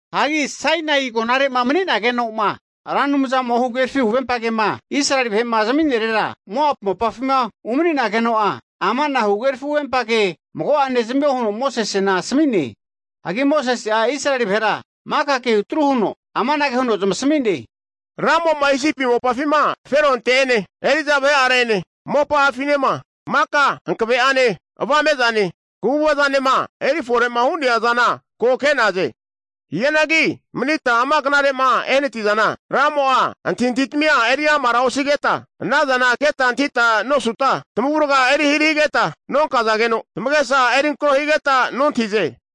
Hagi Sainai agonare'ma mani'nageno'ma Ra Anumzamo'a huhagerafi huvempa kema Israeli vahe'ma zami'nerera, Moapu mopafima umani'nageno'a, ama'na huhagerafi huvempa kea mago'ane zamio huno Mosesena asami'ne. Hagi Mosese'a Israeli vahera maka kehu tru huno amanage huno zamasmi'ne, Ramo'ma Isipi mopafima Feronte'ene, eri'za vahe'are'ene, mopa'afinema, maka hankave'ane avame'zane, kaguvazanema erifore'ma hu'nea zana ko' ke'naze. Hianagi manita ama knare'ma ehanatizana, Ramo'a antahintahitamia eri amara osigeta, ana zana keta antahita nosuta, tamavurga eri hari higeta nonkazageno, tamagesa erinkro higeta nontahize!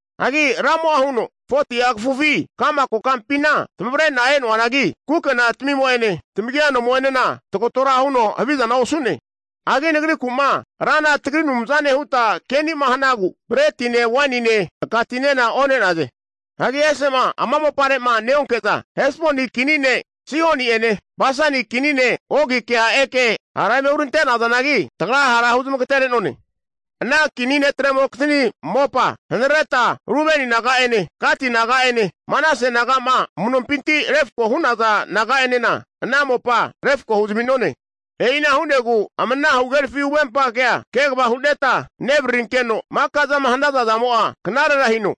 Hagi Ramo'a huno, 40'a kafufi ka'ma kokampina tamavare'na e'noanagi, kukena tamimo'ene tamagia anomo'enena tagatora huno havizana osu'ne. Hagi Nagriku'ma Rana tagri Anumzane huta keni'ma hanagu, bretine wainine aka tinena one'naze. Hagi ese'ma ama mopare'ma neonke'za, Hesboni kini ne' Sihoni'ene Basani kini ne' Ogikea eke hara eme hurante'nazanagi, tagra hara huzamagatere'none. Ana kini netremokizni mopa hanareta Rubeni naga'ene, Gati naga'ene, Manase naga'ma amu'nompinti refko hu'naza naga'enena, ana mopa refako huzami'none. E'ina hu'negu ama ana huhagerafi huvempa kea kegava hu'neta nevararinkeno, maka zama hanaza zamo'a knarera hino.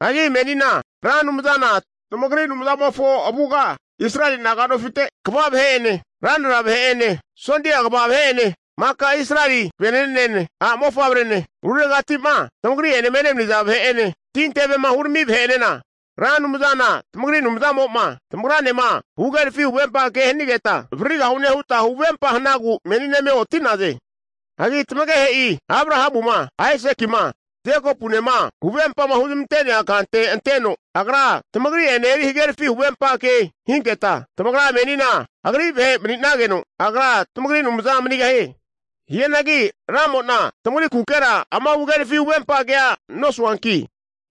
Hagi menina Ra Anumzana tamagri Anumzamofo avuga Israeli naga nofite kva vahe'ene, ranra vahe'ene, sondia kva vahe'ene, maka Israeli vene'nene, a' mofavrene, ruregati'ma tamagri'enema enemaniza vahe'ene, tintevema hurami vahe'enena, Ra Anumzana tamagri Anumzamo'ma tamagranema huhagerafi huvempa ke hanigeta avararigahune huta huvempa hanagu menina eme oti'naze. Hagi tamagehe'i Abrahamuma, Aisakima, Jekopunema huvempama huzamante'nea kante anteno, Agra tamagri'ene eri hagerafi huvempa ke hinketa tamagra menina Agri vahe' mani'nageno, Agra tamagri Anumza manigahie. Hianagi Ramo'na tamagrikukera ama huhagerafi huvempa kea nosuanki,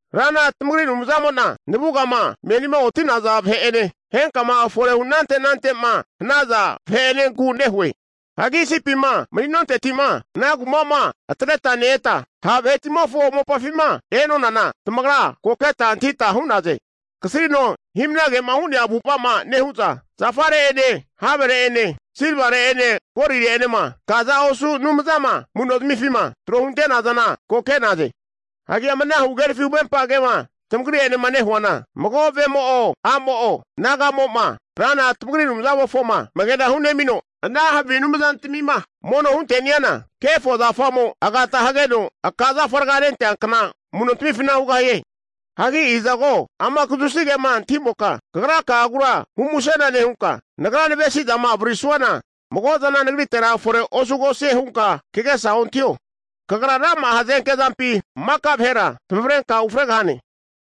Rana tamagri Anumzamo'na navugama menima oti'naza vahe'ene, henkama fore hu anante ante'ma hanaza vahe'enenku nehue. Hagi Isipima mani'nonteti'ma ana kuma'ma atreta ne-eta ha' vahetimofo mopafima e'nonana, tamagra ko keta antahita hu'naze. Kasrino hi'mnage'ma hu'nea avu'ava'ma nehu'za, zafare'ene havere'ene, silvare'ene, golire'enema kaza osu' anumzama amu'no zamifima trohuntenazana ko ke'naze. Hagi ama huhagerafi huvempa kema tamagri'enema nehuana, mago vemo'o a'mo'o naga'mo'ma, Rana tamagri Anumzamofoma amagena hunemino ana havi anumzantamima mono hunte'niana kefo zafamo agata hageno aka' zafa raga rentea kna amu'nontamifinti hugahie. Hagi izago ama kazusi kema antahimoka kagraka'agura humusena nehunka, nagra navesi'zama avaririsuana mago zana nagritera fore osugosie hunka kagesa ontahio. Kagra rama'a hazenke zampi maka vahera zamavarenka ufregahane.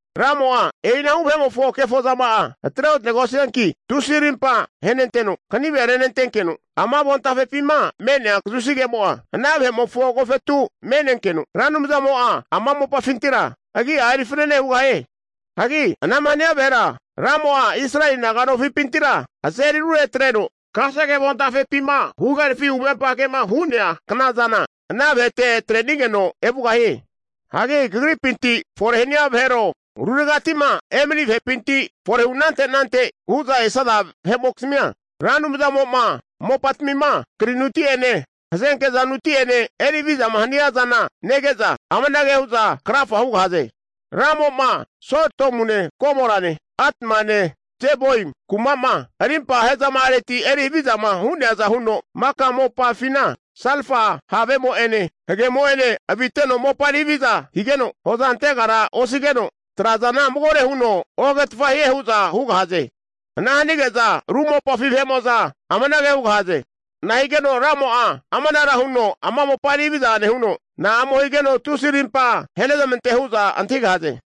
Ramo'a e'inahu vahe'mofo kefozama'a atreontegosianki, tusi arimpa ahenenteno kanive renentenkeno, ama avontafepima me'nea kazusi kemo'a ana vahe'mofo agofetu me'nenkeno Ra Anumzamo'a ama mopafintira agi'a eri fanane hugahie. Hagi ana'ma hania vahera Ramo'a Israeli naga'nofipintira azeri arure atreno, kasege avontafepima huhagerafi huvempa kema hu'nea knazana ana vahete atre'nigeno evugahie. Hagi kagripinti fore hania vahero, ruregati'ma e'mani vahepinti forehu anante anante hu'za esaza vahe'mokizmia, Ra Anumzamo'ma mopatamima krinuti'ene hazenke'za nuti'ene eri havizama hania zana nege'za, amanage hu'za krafa hugahaze, Ramo'ma Sodomune, Gomorane, Atmane, Zeboimi kuma'ma arimpa ahezama'areti eri havizama hu'neaza huno maka mopafina salfa havemo'ene hagemo'ene aviteno mopa eri haviza higeno, hoza antegara osigeno trazana magore huno ohagetfa hie hu'za hugahaze. Ana hanige'za ru mopafi vahe'mo'za amanage hugahaze, nahigeno Ramo'a amanara huno ama mopa eri haviza nehuno, na'amo higeno tusi arimpa ahenezamante hu'za antahigahaze.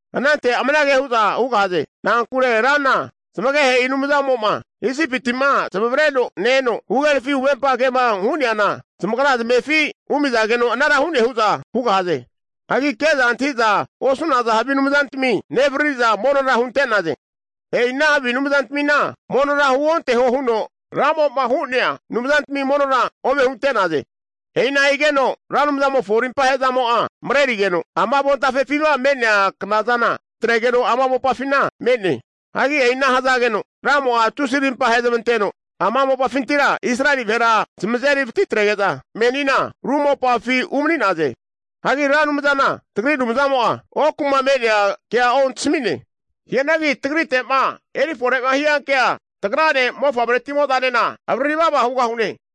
Anante amanage hu'za hugahaze, na'ankure Rana zamagehe'i Anumzamo'ma Isipiti'ma zamavareno ne-eno huhagerafi huvempa kema hu'neana zamagra zamefi humi'zageno, anara hu'ne hu'za hugahaze. Hagi ke'za antahi'za osu'naza havi anumzantami nevariri'za monora hunte'naze. E'i ana havi anumzantmina monora huonteho huno Ramo'ma hu'nea anumzantami monora ome hunte'naze. E'ina higeno Ra Anumzamofo arimpa he'zamo'a marerigeno, ama avontafepima me'nea knazana atregeno ama mopafina me'ne. Hagi e'ina hazageno Ramo'a tusi arimpa ahezamanteno, ama mopafintira Israeli vahera zamazeri vatitrege'za menina ru mopafi umani'naze. Hagi Ra Anumzana tagri Anumzamo'a oku'ma me'nea kea ontasami'ne. Hianagi tagrite'ma erifore'ma hiankea tagrane mofavretimozanena avarari vava hugahune.